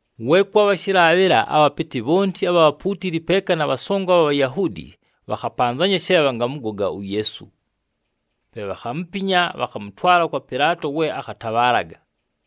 We kwabha shɨlaabhɨla, abhapɨtɨ bhonti abha bhapuutili peeka na bhasongo abha Bhayahuudi bhakhapanzanya she bhangamʉgoga uYeesu. Pe bhakhamupinya, bhakhamʉtwala kwa Pɨlaato we akhatabhaalaga.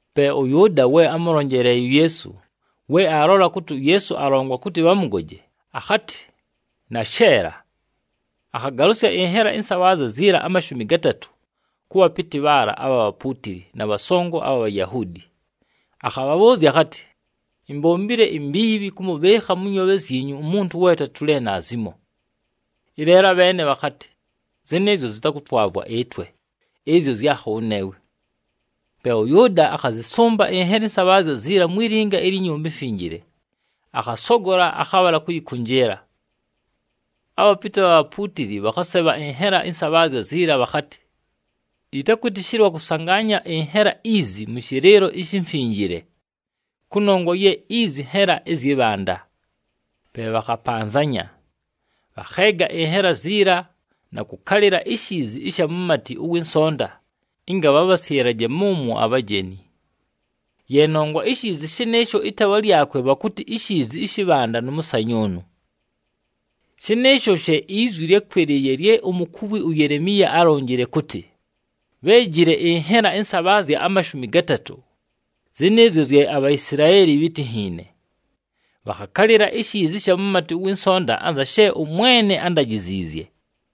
Pe ʉYʉʉda, we ámʉlonjeleeye uYeesu, we aalola kʉtɨ uYeesu alongwa kʉtɨ bhamʉgoje, akhatɨ, “Nasheela.” Akhagalʉsya ɨnhela ɨnsabhaazya ziila amashumi gatatʉ, kʉ bhapɨtɨ bhaala abha bhapuutili na bhasongo abha Bhayahuudi. Akhabhabhʉʉzya akhatɨ, “Imbombile imbiibhi kʉmʉbhɨɨkha mʉ nyoobhe zyinyu umuntu we atatulile naazimo.” Ɨleelo abheene bhakhatɨ, “Zɨnɨɨzyo zɨtakʉtwavwa ɨtwe, ɨzyo zyakho wʉneewe.” Pe ʉYʉʉda akhazɨsʉmba ɨnhela ɨnsabhaazya ziila mwi linga ilyi Nyumba iMfinjile, akhasogola, akhabhala kʉyɨkʉnjɨɨla. Abhapɨtɨ abha bhapuutili bhakhasebha ɨnhela ɨnsabhaazya ziila, bhakhatɨ, “Yɨtakwɨtɨshɨlwa kʉsangaanya ɨnhela izi mʉ shɨlɨɨlo ishi mfinjile, kʉnongwa ye izi nhela zyɨ bhanda.” Pe bhakhapanzanya, bhakheega ɨnhela ziila na kʉkalɨla ishiizi ɨsha mumati ʉwɨ nsonta, ɨnga bhabhasyɨlaje mʉmwo abhajeni. Ye nongwa ishiizi shɨnɨɨsho ɨtaawa lyakwe bhakʉtɨ iShiizi ɨshɨ Bhanda nʉ mʉsanyʉʉnʉ. Shɨnɨɨsho she izwi lyákwɨlɨɨye lye umukuwi uYelemiya álonjile kʉtɨ, “Bhéejile ɨnhela ɨnsabhaazya amashumi gatatʉ, zɨnɨɨzyo zye aBhaisilaeli bhítinhiine. Bhakhakalɨla ishiizi ɨsha mumati ʉwɨ nsonta anza she ʉMwene ándajiziizye.”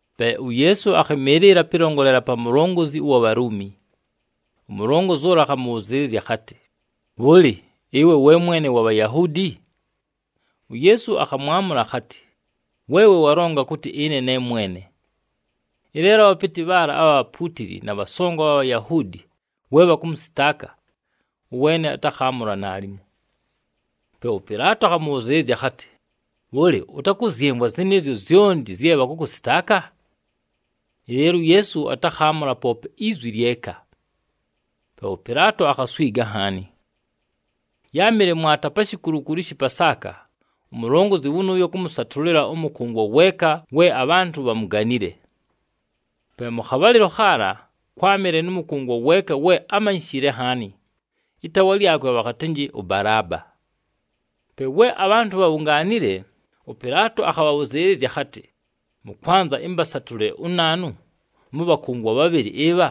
Pe uYeesu akhɨmɨɨlɨla pɨlongolela pa mulongozi ʉwa Bhaluumi, umulongozi ʉla akhamʉbhʉzɨɨlɨzya akhatɨ, “Bhʉlɨ, ɨwe we Mwene wa Bhayahuudi?” UYeesu akhamwamʉla akhatɨ, “Weewe walonga kʉtɨ ɨne ne mwene.” Ɨleelo abhapɨtɨ bhaala abha bhapuutili na bhasongo abha Bhayahuudi we bhakʉmʉsɨtaaka, ʉweene atakhabhaamʉla naalimo. Pe ʉPɨlaato akhamʉbhʉzɨɨlɨzya akhatɨ, “Bhʉlɨ, ʉtakʉzyɨmvwa zɨnɨɨzyo zyonti zye bhakʉkʉsɨtaaka?” Ɨleelo uYeesu atakhaamʉla poope izwi lyeka. Pe ʉPɨlaato akhaswiga nhaani. Yáamɨle mwata pa shikulukulu ɨshɨ Pasaaka, umulongozi wʉnʉʉyo kʉmʉsatʉlɨla ʉmʉkʉngwa weeka we abhantʉ bhamuganile. Pe mʉ khabhalɨlo khaala, kwámɨle nʉ mʉkʉngwa weeka we ámanyishile nhaani, ɨtaawa lyakwe bhakhatɨnjɨ ʉBalaaba. Pe we abhantʉ bhabhungaanile, ʉPɨlaato akhabhabhʉzɨɨlɨzya akhatɨ, “Mʉkwanza ɨmbasatʉlɨle unaanu mʉ bhakʉngwa bhabhɨlɨ ɨbha,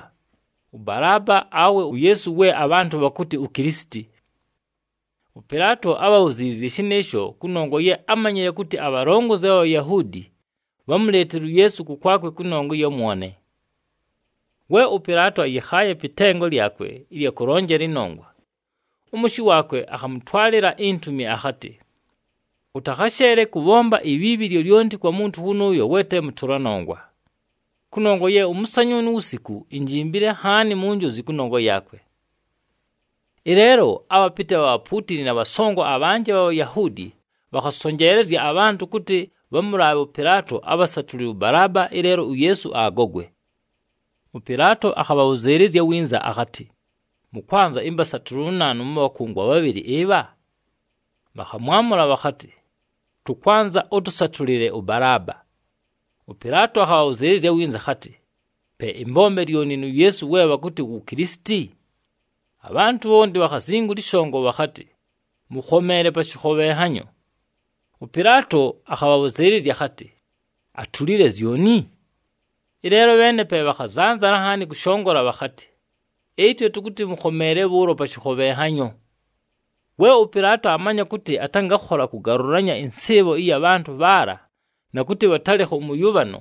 ʉBalaaba awe uYeesu we abhantʉ bhakʉtɨ uKilisiti?” ɄPɨlaato ábhabhuziliziizye shɨnɨɨsho kʉnongwa ye ámanyile kʉtɨ abhalongozi abha Bhayahuudi bhámuleetile uYeesu kʉkwakwe kʉnongwa ɨya mwone. We ʉPɨlaato ayɨkhaaye pɨ tengo lyakwe ɨlya kʉlonjela ɨnongwa, ʉmʉshɨ waakwe akhamʉtwalɨla intumi akhatɨ, “Ʉtakhasheele kʉbhomba ibhiibhi lyolyonti kwa muntu wʉnʉʉyo we te mʉtʉla nongwa, kʉnongwa ye ʉmʉsanyʉʉnʉ uwusiku injimbile nhaani mu njozi kʉnongwa yaakwe.” Ɨleelo abhapɨtɨ abha bhapuutili na bhasongo abhanjɨ abha Bhayahuudi bhakhabhasonjeelezya abhantʉ kʉtɨ bhamʉlaabhe ʉPɨlaato abhasatʉlɨle ʉBalaaba, ɨleelo uYeesu agogwe. ɄPɨlaato akhabhabhʉzɨɨlɨzya winza akhatɨ, “Mʉkwanza ɨmbasatʉlɨle unaanu mʉ bhakʉngwa bhabhɨlɨ ɨbha?” Bhakhamwamʉla bhakhatɨ, “Tʉkwanza ʉtʉsatʉlɨle ʉBalaaba.” ɄPɨlaato akhabhabhʉzɨɨlɨzya winza akhatɨ, “Pe ɨmbombe lyoni nu Yeesu we bhakʉtɨ wu Kilisiti?” Abhantʉ bhonti bhakhazingula ɨshongo bhakhatɨ, “Mʉkhomeele pa shɨkhobhenhanyo!” ɄPɨlaato akhabhabhʉzɨɨlɨzya akhatɨ, “Atulile zyoni?” Ɨleelo abheene pe bhakhazanzala nhaani kʉshongola bhakhatɨ, “Ɨtwe tʉkʉtɨ mʉkhomeele bhʉʉlo pa shɨkhobhenhanyo!” We ʉPɨlaato aamanya kʉtɨ atangakhola kʉgalʉlanya ɨnsɨɨbho ɨya bhantʉ bhaala na kʉtɨ bhatalɨkha ʉmʉyʉbhano,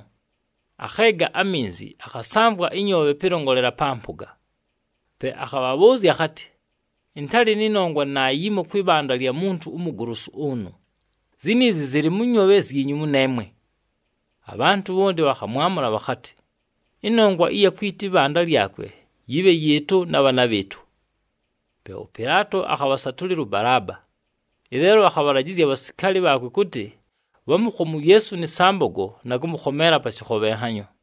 akheega aminzi, akhasamvwa ɨnyoobhe pɨlongolela pa mpʉga. Pe akhabhabhʉʉzya akhatɨ, “Ɨntalɨ nɨ nongwa naayimo kwɨ bhanda lya muntu umugolosu ʉnʉ. Ziniizi zɨlɨ mʉ nyoobhe zyinyu mʉneemwe!” Abhantʉ bhonti bhakhamwamʉla bhakhatɨ, “Ɨnongwa ɨya kwita ɨbhanda lyakwe yɨbhe yɨɨtʉ na bhaana bhɨɨtʉ!” Pe ʉPɨlaato akhabhasatʉlɨla ʉBalaaba, ɨleelo akhabhalajɨzya abhasikaali bhaakwe kʉtɨ bhamʉkhome uYeesu nɨ sambogo na kʉmʉkhomeela pa shɨkhobhenhanyo.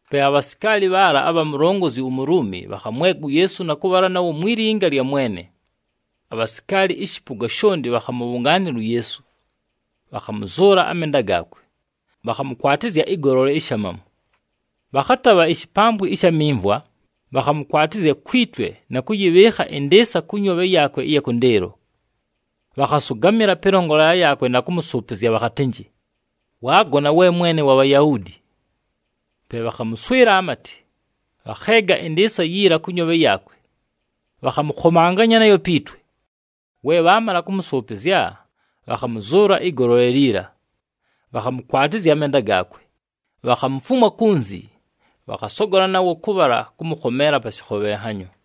Pe abhasikaali bhaala abha mulongozi uMuluumi bhakhamwega uYeesu na kʉbhala nawo mwi linga lya mwene. Abhasikaali ɨshɨpʉga shonti bhakhamʉbhʉngaanɨla uYeesu. Bhakhamʉzʉʉla amenda gaakwe, bhakhamʉkwatɨzya ɨgolole ishamamu. Bhakhatabha ishipambwi ɨsha mimvwa, bhakhamʉkwatɨzya kwi twe na kʉyɨbhɨɨkha ɨndɨɨsa kʉ nyoobhe yaakwe ɨya kʉndɨɨlo. Bhakhasʉgamɨla pɨlongolela yaakwe na kʉmʉsʉʉpɨzya bhakhatɨnjɨ, “Waagona, we Mwene wa Bhayahuudi!” Pe bhakhamʉswɨla amatɨ, bhakheega ɨndɨɨsa yiila kʉ nyoobhe yaakwe, bhakhamʉkhomanganya nayo pi twe. We bhaamala kʉmʉsʉʉpɨzya, bhakhamʉzʉʉla ɨgolole liila, bhakhamʉkwatɨzya amenda gaakwe. Bhakhamufumwa kunzi, bhakhasogola nawo kʉbhala kʉmʉkhomeela pa shɨkhobhenhanyo.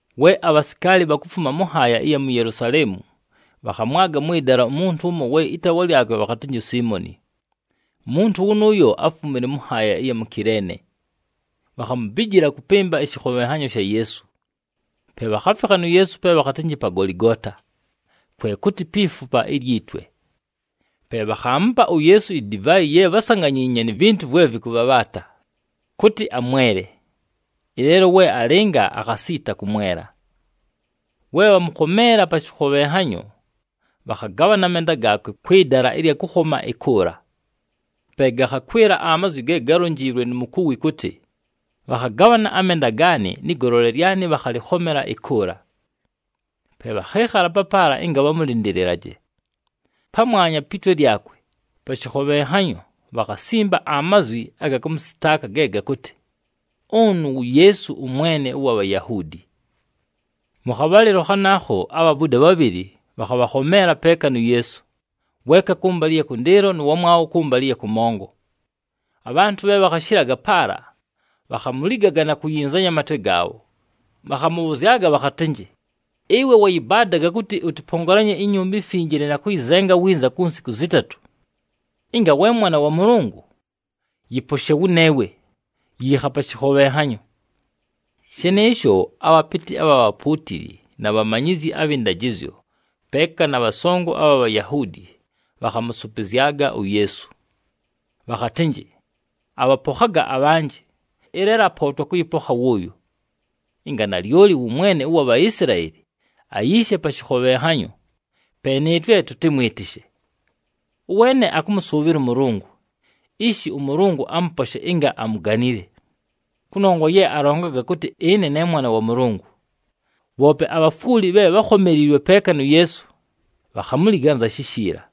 We abhasikaali bhakufuma mʉ nhaaya ɨya mu Yelusaleemu, bhakhamwaga mwɨ dala umuntu ʉmo we ɨtaawa lyakwe bhakhatɨnjɨ uSiimoni. Umuntu wʉnʉʉyo áfumile mʉ nhaaya ɨya mu Kileene. Bhakhamubijila kʉpɨmba ɨshɨkhobhenhanyo sha Yeesu. Pe bhakhafikha nu Yeesu pe bhakhatɨnjɨ pa Goligoota, kwe kʉtɨ, “Pi Fupa ilyi Twe.” Pe bhakhaamupa uYeesu idivaayi ye bhásanganyiinye ni vintu vwe vɨkʉbhabhaata, kʉtɨ amwele. Ɨleelo we alɨnga, akhasiita kʉmwela. We bhamʉkhomeela pa shɨkhobhenhanyo, bhakhagabhana amenda gaakwe kwɨ dala ɨlya kʉkhoma ɨkʉʉla. [Pe gakhakwɨla amazwi ge gálonjiilwe nu mukuwi kʉtɨ, “Bhakhagabhana amenda gaanɨ nɨ golole lyanɨ bhakhalɨkhomela ɨkʉʉla.”] Pe bhakhɨɨkhala papaala ɨnga bhamʉlɨndɨlɨlaje. Pamwanya pi twe lyakwe, pa shɨkhobhenhanyo bhakhasimba amazwi aga kʉmʉsɨtaaka ge gakʉtɨ, “Ʉnʉ wu Yeesu, ʉMwene ʉwa Bhayahuudi.” Mʉ khabhalɨlo khanaakho abhabuda bhabhɨlɨ, bhakhabhakhomeela peeka nu Yeesu, weeka kʉmbalɨ ɨya kʉndɨɨlo nʉ wamwabho kʉmbalɨ ɨya kʉmongo. Abhantʉ bhe bhakhashɨlaga paala, bhakhamuligaga na kuyinzanya amatwe gaabho. Bhakhamʉbhʉzyaga bhakhatɨnjɨ, “Ɨwe wayɨbaadaga kʉtɨ ʉtɨpongolanye iNyumba iMfinjile na kʉyɨzenga winza ku nsiku zɨtatʉ. Ɨnga we Mwana wa Mʉlʉngʉ, yɨposhe wʉneewe, yiikha pa shɨkhobhenhanyo!” Shɨnɨɨsho, abhapɨtɨ abha bhapuutili na bhamanyizyi abhɨ ndajɨzyo peeka na bhasongo abha Bhayahuudi bhakhamʉsʉpɨzyaga uYeesu. Bhakhatɨnjɨ, “Abhapokhaga abhanjɨ, ɨleelo apootwa kʉyɨpokha wʉʉyo! Ɨnga nalyoli wʉ Mwene ʉwa Bhaisilaeli, ayiishe pa shɨkhobhenhanyo, pe nɨɨtwe tʉtɨmwɨtɨshe. Ʉweene akʉmʉsʉʉbhɨla ʉMʉlʉngʉ, ishi ʉMʉlʉngʉ amʉposhe ɨnga amuganile. Kʉnongwa ye alongaga kʉtɨ, ‘Ɨne ne Mwana wa Mʉlʉngʉ.’” Bhoope abhafwuli bhe bhákhomeliilwe peeka nu Yeesu, bhakhamuliga anza shishiila.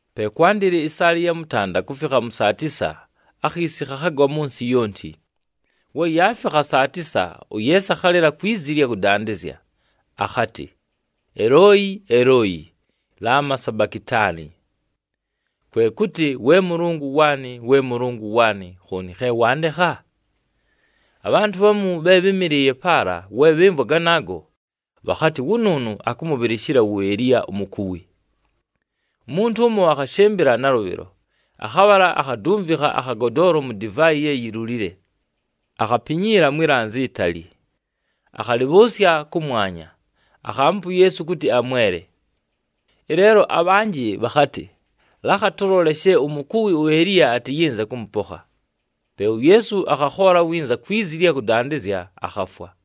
Pe kwandɨla ɨsaala ɨya mʉtanda kufikha mʉ saa tisa, akhiisi khakhagwa mʉ nsɨ yonti. We yaafikha saa tisa, uYeesu akhalɨla kwi zi ɨlya kʉdandɨzya akhatɨ, “Elooyi! Elooyi! Lama sabakitaani?” Kwe kʉtɨ, “We Mʉlʉngʉ waanɨ! We Mʉlʉngʉ waanɨ! Khooni khe wandekha?” Abhantʉ bhamu bhe bhɨ́mɨlɨɨye paala we bhɨmvwa ganaago, bhakhatɨ, “Wʉnʉʉnʉ akʉmʉbhɨlɨshɨla wu Eliya umukuwi.” Umuntu ʉmo akhashɨmbɨla nalʉbhɨlo akhabhala akhadumvikha akhagodoolo mu divaayi ye yilulile, akhapinyiila mwi lanzi itali, akhalɨbhʉʉsya kʉmwanya, akhaamupa uYeesu kʉtɨ amwele. Ɨleelo abhanjɨ bhakhatɨ, “Lakha tʉlole she umukuwi uEliya atɨyɨnze kʉmʉpokha!” Pe uYeesu akhakhoola winza kwi zi ɨlya kʉdandɨzya, akhafwa.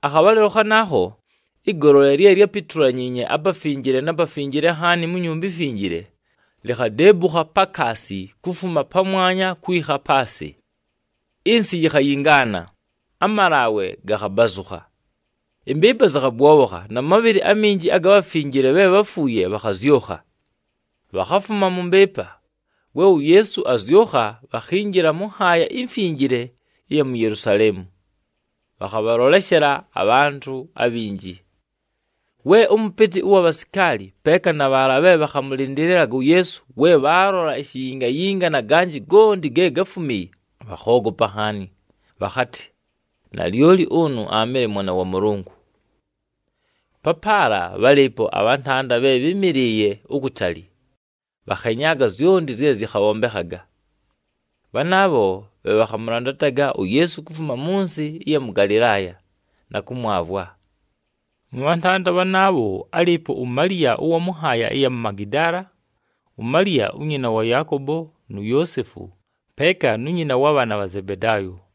Akhabhalɨlo khanaakho, ɨgolole lye lyápitulanyiinye aPafinjile na Pafinjile Nhaani mu Nyumba iMfinjile, likhadeebukha pakaasi kufuma pamwanya kwikha paasɨ. Ɨnsɨ yikhayingaana, amalaawe gakhabazʉkha. Ɨmbɨɨpa zɨkhabwobhokha na mabhɨlɨ aminji aga bhafinjile bhe bháfuuye bhakhazyʉkha. Bhakhafuma mʉ mbɨɨpa, we uYeesu azyʉkha, bhakhinjila mʉ nhaaya imfinjile ɨya mu Yelusaleemu, bhakhabhaloleshela abhantʉ abhinji. We ʉmʉpɨtɨ ʉwa bhasikaali peeka na bhaala bhe bhakhamʉlɨndɨlɨlaga uYeesu bhaalola ishiyingayinga na ganjɨ gonti ge gáfumiiye, bhakhoogopa nhaani, bhakhatɨ, “Nalyoli ʉnʉ aamɨle Mwana wa Mʉlʉngʉ!” Papaala bhálɨɨpo abhantanda bhe bhɨ́mɨlɨɨye ukutali, bhakhenyaaga zyonti zye zɨkhabhombekhaga. Bhanaabho bhe bhakhamʉlandataga uYeesu kufuma mʉ nsɨ ɨya mʉ Galɨlaaya, na kʉmwavwa. Mʉ bhantanda bhanaabho, álɨɨpo uMaliya ʉwa mʉ nhaaya ɨya mu Magidaala, uMaliya unyina wa Yaakobo nu Yoosefu, peeka nu nyina wa bhaana bha Zebedaayo.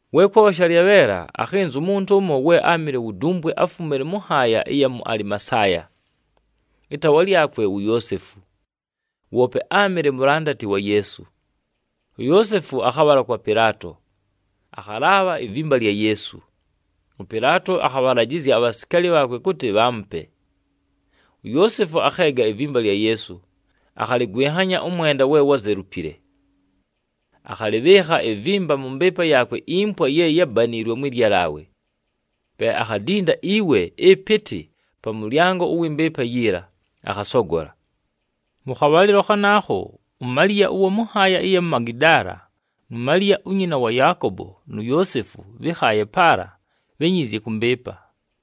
We kwabha shalyabheela, akhɨnza umuntu ʉmo we áamɨle wu dumbwe, áfumile mʉ nhaaya ɨya ku Alimasaaya, ɨtaawa lyakwe wu Yoosefu. Woope áamɨle mulandati wa Yeesu. UYoosefu akhabhala kwa Pɨlaato, akhalaabha ivimba lya Yeesu. ɄPɨlaato akhabhalajɨzya abhasikaali bhaakwe kʉtɨ bhaamupe. UYoosefu akheega ivimba lya Yeesu, akhalɨgwɨnhanya ʉmwenda we wuzelupile. Akhalɨbhɨɨkha ivimba mʉ mbɨɨpa yaakwe impwa ye yábaniilwe mwɨ lyalaawe. Pe akhadinda iwe ɨpɨtɨ pa mʉlyango ʉwɨ mbɨɨpa yiila, akhasogola. Mʉ khabhalɨlo khanaakho, uMaliya ʉwa mʉ nhaaya ɨya mu Magidaala nu Maliya unyina wa Yaakobo nu Yoosefu bhɨ́khaaye paala, bhényiizye kʉ mbɨɨpa.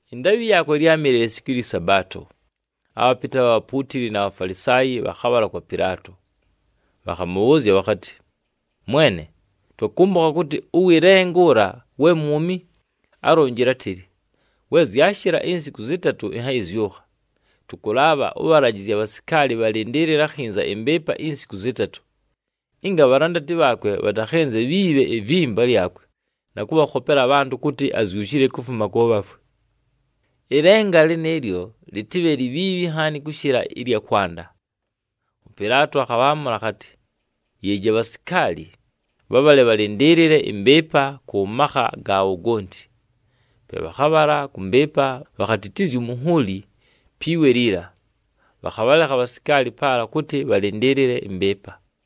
Ɨndaabhɨ yaakwe lyámɨle lisiku lyɨ Sabaato, abhapɨtɨ abha bhapuutili na Bhafalisaayi bhakhabhala kwa Pɨlaato. Bhakhamʉbhʉʉzya bhakhatɨ, “Mwene, twakʉmbʉkha kʉtɨ ʉwɨ lenga ʉla we mwumi, álonjile átɨlɨ, ‘We zyashɨla insiku zɨtatʉ, ɨnhayɨzyʉkha.’ Tʉkʉlaabha ʉbhalajɨzye abhasikaali bhalɨndɨɨlɨle akhinza ɨmbɨɨpa insiku zɨtatʉ, ɨnga abhalandati bhaakwe bhatakhiibhe ivimba lyakwe na kʉbhakhopela abhantʉ kʉtɨ azyushile kufuma kʉ bhafwe. Ɨlenga lɨnɨɨlyo lɨtɨbhe libhiibhi nhaani kʉshɨla ɨlya kwanda.” ɄPɨlaato akhabhaamʉla akhatɨ, “Yeeji abhasikaali. Bhabhale bhalɨndɨɨlɨle ɨmbɨɨpa kʉ makha gaabho gonti.” Pe bhakhabhala kʉ mbɨɨpa, bhakhatitizya umunhuuli pi we liila, bhakhabhalekha abhasikaali paala kʉtɨ bhalɨndɨɨlɨle ɨmbɨɨpa.